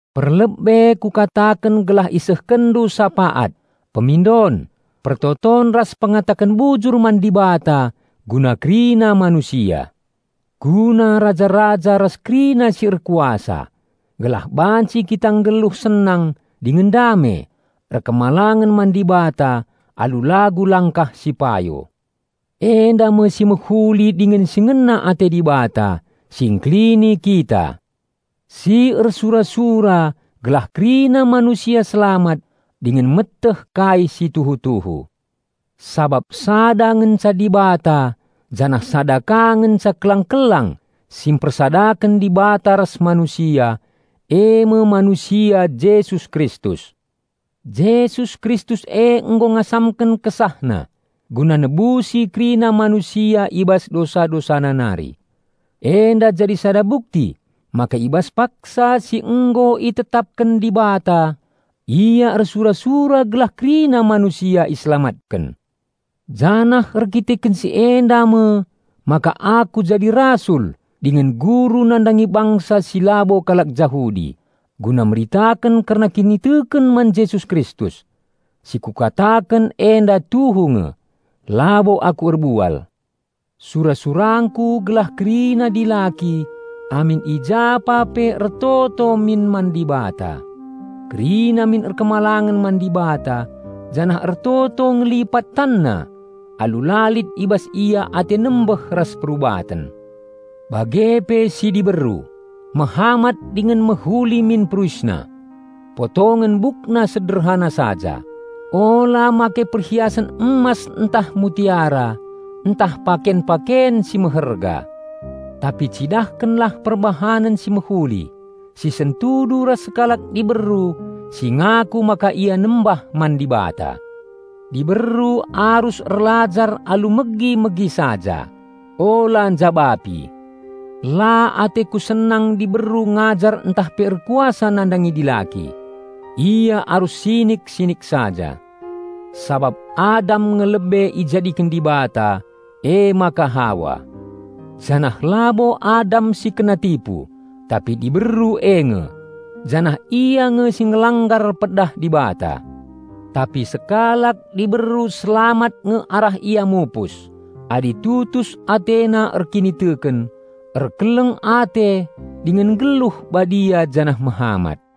Perlebe kukataken gelah isehkenndu sapaat, pemindon, pertoton ras pengataken bujur man Dibata guna kerina manusia; guna raja-raja ras kerina si erkuasa, gelah banci kita nggeluh senang dingen dame, erkemalangen man Dibata alu lagu langkah si payo. Enda me si mehuli dingen si ngena ate Dibata, Si Ngkelini kita, si ersura-sura gelah kerina manusia selamat dingen meteh kai si tuhu-tuhu. Sabap sada ngenca Dibata janah sada ka ngenca kelang-kelang si mpersadaken Dibata ras manusia, e me manusia Jesus Kristus. Jesus Kristus e nggo ngasamken KesahNa guna nebusi kerina manusia i bas dosa-dosana nari. Enda jadi sada bukti maka i bas paksa si nggo itetapken Dibata, Ia ersura-sura gelah kerina manusia iselamatken. Janah erdandanken si enda me maka aku jadi rasul dingen guru nandangi bangsa si labo kalak Jahudi, guna meritaken kerna kiniteken man Jesus Kristus. Si kukataken enda tuhu nge, labo aku erbual. Sura-surangku gelah kerina dilaki amin i japa pe ertoto min man Dibata. Kerina min patuh man Dibata janah ertoto ngelipat tanna alu la lit i bas ia ate nembeh ras perubaten. Bage pe si diberu, mehamat dingen mehuli min peruisna. Potongen bukna sederhana saja; ula make perhiasen emas ntah mutiara ntah paken-paken si meherga. Tapi cidahkenlah perbahanen si mehuli, si sentudu ras sekalak diberu si ngaku maka ia nembah man Dibata. Diberu arus erlajar alu megi-megi saja, ula njabapi. La ateku senang diberu ngajar ntah pe erkuasa nandangi dilaki. Ia arus sinik-sinik saja. Sabap Adam nge lebe ijadiken Dibata, emaka Hawa. Janah labo Adam si kena tipu, tapi diberu e nge, janah ia nge si ngelanggar pedah Dibata. Tapi sekalak diberu selamat nge arah ia mupus, adi tutus atena erkiniteken, erkeleng ate dingen nggeluh badia janah mehamat.